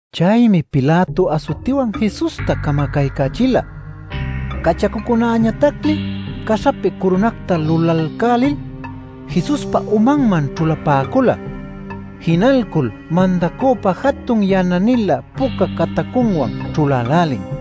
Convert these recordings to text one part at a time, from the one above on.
Chaymi Pilato asutiwan Jesusta camacaycächila. Cachacucunäñatacmi caśhapi curunacta lulalcälil Jesuspa umanman ćhulapäcula. Jinalcul mandacüpa jatun yana-nilä puca catacunwan ćhulälälin.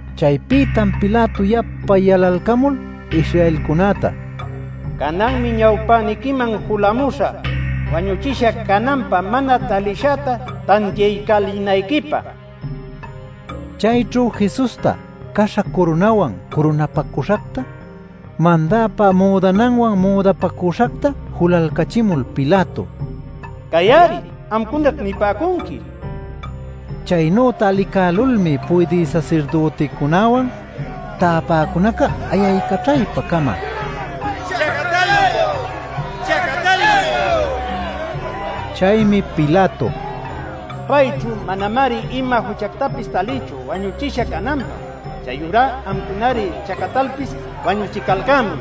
Chaypïtam Pilato yapa yalalcamul Israelcunäta: “Cananmi ñawpäniquiman julamuśhä wañuchisha cananpä mana talishäta tantiaycälinayquipä” nin. Chayćhu Jesusta caśha curunawan curunapacüśhacta, mandäpa müdananwan müdapacüśhacta julalcachimul Pilato: “Cay-ari. Amcunaćh nipäcunqui” nin. Chaynüta licälulmi puydï sasirdüticunäwan täpäcunaca ayaycaćhaypa-cama: “¡Chacatäluy! ¡Chacatäluy!” nicuyalcan. Chaymi Pilato: “Payćhu manamari ima juchactapis talïchu wañuchisha cananpä. Chayurá amcunari chacatalpis wañuchicalcämuy”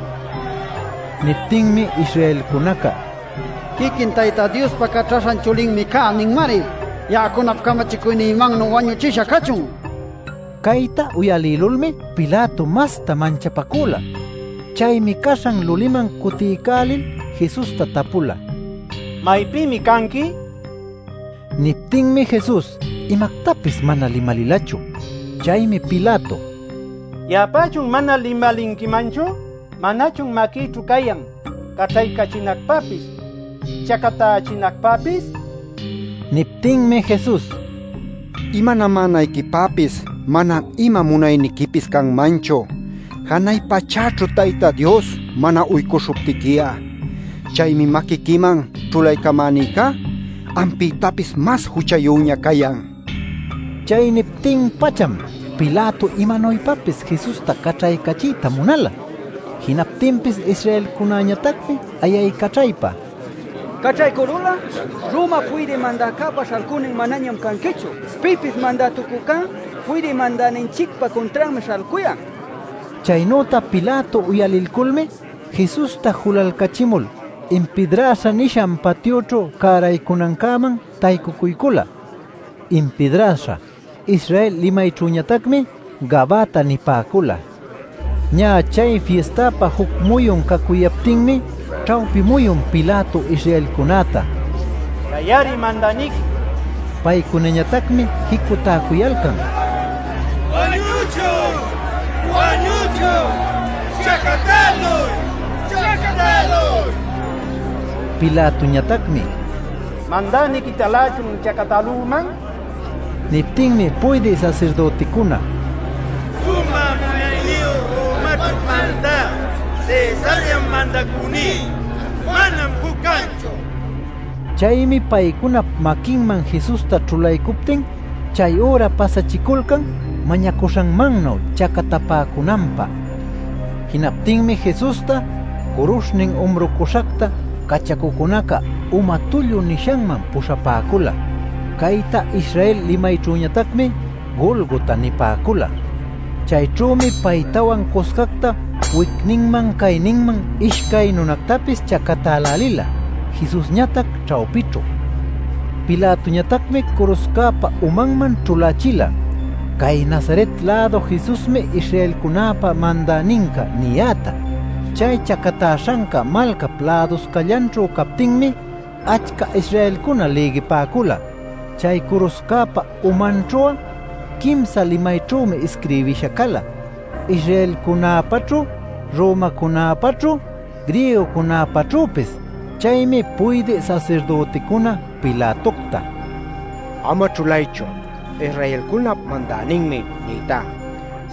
nin. Niptinmi Israelcunaca: “¡‘Quiquin Tayta Diospa Caćhaśhan Chulinmi cayá’ ninmari! ¡Ya'acunap camachicuynïmannu wañuchisha cachun!” nicuyalcan. Cayta uyalïlulmi Pilato masta manchapacüla. Chaymi caśhan luliman cutiycälil Jesusta tapula: “¿Maypïmi canqui?” nil. Niptinmi Jesus imactapis mana limalilachu. Chaymi Pilato: “¿Ya'apächun mana limalinquimanchu? ¿Manachun maquïćhu cayan caćhaycachinacpäpis chacatächinacpäpis?” nin. Niptinmi Jesus: “Imanamänayquipäpis manam ima munayniquipis canmanchu, janay pachäćhu Tayta Dios mana uycuśhuptiqui'a. Chaymi maquiquiman ćhulaycamänïcá, ampïtapis mas juchayüña cayan” nin. Chay niptin-pacham Pilato imanuypapis Jesusta caćhaycachiyta munala. Jinaptinpis Israelcunäñatacmi ayaycaćhaypa: “Caćhaycülul'a Romap Puydï Mandäcäpa śhalcünin manañam canquichu. Pipis mandätucücá puydï mandäninchicpa cuntranmi śhalcuyan” nicuyalcan. Chaynüta Pilato uyalilculmi Jesusta julalcachimul Impidraśha nishan patyućhu cäraycunancäman taycucuycula. (“Impidraśha” Israel limayćhüñatacmi Gabata nipäcula.) Ñä chay fistapä juc muyun cacuyaptinmi ćhawpi muyun Pilato Israelcunäta: “Cay-ari Mandäniqui” nin. Paycunañatacmi jicutäcuyalcan: “¡Wañuchun! ¡Wañuchun! ¡Chacatäluy!” nil. Pilatoñatacmi: “¿Mandänïquitalächun chacatälüman?” nin. Niptinmi puydï sasirdüticuna “Sumä munayniyu Romaćhu mandä Cesarllam mandacüní. Manam juc canchu” nicuyalcan. Chaymi paycunap maquinman Jesusta ćhulaycuptin chay üra pasachiculcan mañacuśhanmannuy chacatapäcunanpä. Jinaptinmi Jesusta curuśhnin umrucuśhacta cachacucunaca Uma Tullu nishanman puśhapäcula. (Cayta Israel limayćhüñatacmi Golgota nipäcula.) Chayćhümi paytawan cuscacta wicninman cayninman ishcay nunactapis chacatälälila Jesusñatac ćhawpićhu. Pilatoñatacmi curuśhcäpa umanman ćhulächila “Cay Nazaret-lädu Jesusmi Israelcunäpa Mandäninca” niyäta. Chay chacatäśhanca malcap läduscallanćhu captinmi achca Israelcuna lïgipäcula. Chay curuśhcäpa umanćhu'a quimsa limayćhümi isquirbisha cala: Israelcunäpaćhu, Romacunäpaćhu, Griegocunäpaćhüpis. Chaymi puydï sasirdüticuna Pilatocta: “Ama ćhulaychu ‘Israelcunap Mandäninmi’ nïtá,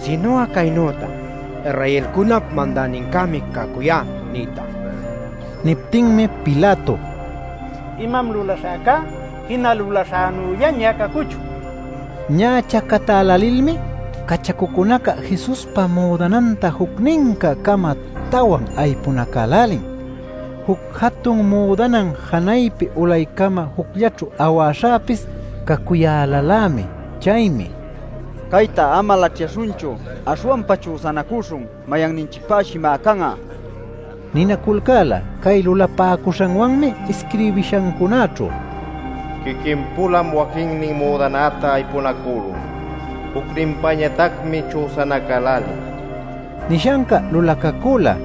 sinu'a caynüta ‘Israelcunap Mandänincämi cacuyá’ nïta” nin. Niptinmi Pilato: “Imam lulaśhäcá jina lulaśhänüllaña cacuchun” nin. Ñä chacatälälilmi cachacucunaca Jesuspa müdananta jucnincä-cama tawan aypunacälälin. Juc jatun müdanan janaypi ulaycama jucllaćhu awäśhäpis cacuyälalämi. Chaymi “Caytá ama laćhyaśhunchu. Aśhwanpa chüsanacüśhun, mayanninchicpäshi, má can'a” ninaculcäla. Cay lulapäcuśhanwanmi isquirbishancunaćhu: “Quiquin-pulam waquinnin müdanäta aypunacülun, jucninpañatacmi chüsanacälälin” nishanca lulacacüla.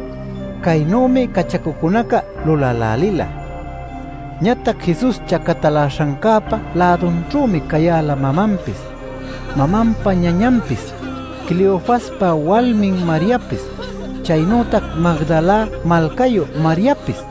Caynümi cachacucunaca lulälälila. Ñatac Jesus chacataläśhancäpa lädunćhümi cayäla mamanpis, mamanpa ñañanpis, Cleofaspa walmin Mariapis, chaynütac Magdala malcayu Mariapis.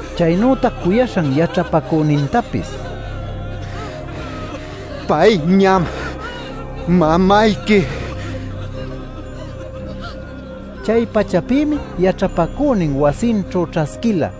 Chaynütac cuyaśhan yaćhapacünintapis: “Payñam mamayqui” nin. Chay-pachapïmi yaćhapacünin wasinćhu ćhasquila.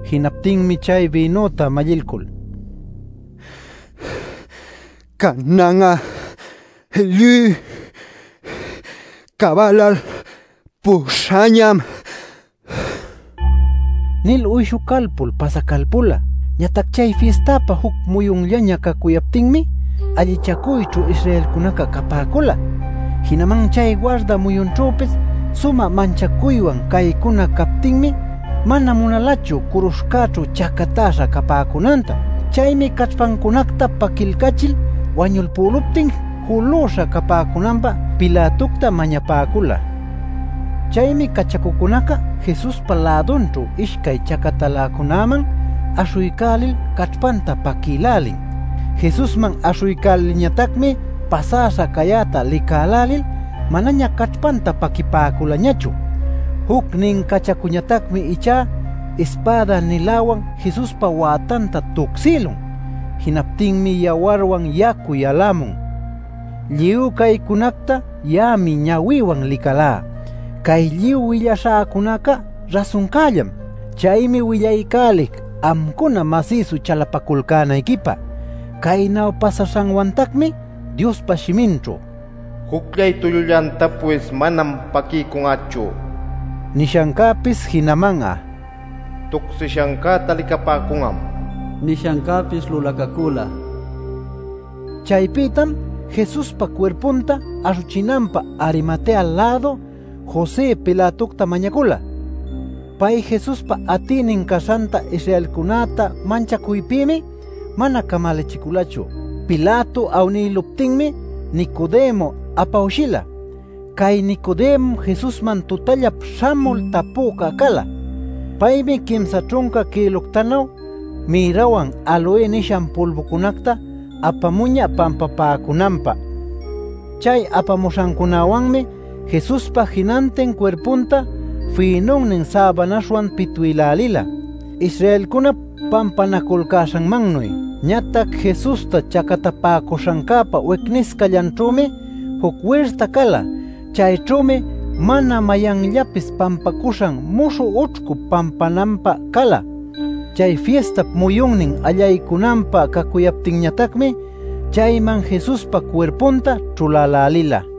Jinaptinmi chay bïnüta mallilcul: “Canan'a lluy cabalalpüśhañam” nil uyshucalpul pasacalpula. Ñatac chay fistapä juc muyunllaña cacuyaptinmi allichacuyćhu Israelcunaca capäcula. Jinaman chay warda muyunćhüpis sumä manchacuywan caycuna captinmi mana munalachu curuśhcäćhu chacatäśha capäcunanta. Chaymi caćhpancunacta paquilcachil wañulpüluptin julüśha capäcunanpä Pilatocta mañapäcula. Chaymi cachacucunaca Jesuspa lädunćhu ishcay chacataläcunäman aśhuycälil caćhpanta paquïlälin. Jesusman aśhuycälilñatacmi pasäśha cayäta licälälil manaña caćhpanta paquipäculañachu. Jucnin cachacuñatacmi ichá ispäda-niläwan Jesuspa wätanta tucsïlun. Jinaptinmi yawarwan yacu yalämun. Lluy caycunacta ya'ami ñawïwan licälá. Cay lluy willaśhäcunaca rasuncällam. Chaymi willaycälic amcuna masïsu chalapaculcänayquipä. Caynu pasaśhanwantacmi Diospa shiminćhu “Jucllay tullullantapis manam paquiycun'achu” nishancäpis jinaman'a “Tucsishancäta licapäcun'am” nishancäpis lulacacüla. Chaypïtam Jesuspa cuirpunta aśhuchinanpä Arimatea-lädu José Pilatocta mañacula. (Pay Jesuspa atïnin caśhanta Israelcunäta manchacuypïmi mana camalachiculachu.) Pilato awnïluptinmi Nicodemo apawshila. (Cay Nicodemom Jesusman tutallap śhamul tapüca cala.) Paymi quimsa ćhunca kïluctanuy mirrawan aloe nishan pulbucunacta apamuñä pampapäcunanpä. Chay apamuśhancunäwanmi Jesuspa jinantin cuirpunta fïnunnin säbanaśhwan pitwïlälila, Israelcunap pampanaculcäśhanmannuy. Ñatac Jesusta chacatapäcuśhancäpa wicniscallanćhümi juc wirta cala. Chayćhümi mana mayanllapis pampacuśhan muśhü ućhcu pampananpä cala. Chay fistap muyunnin allaycunanpä cacuyaptinñatacmi chayman Jesuspa cuirpunta ćhulälälila.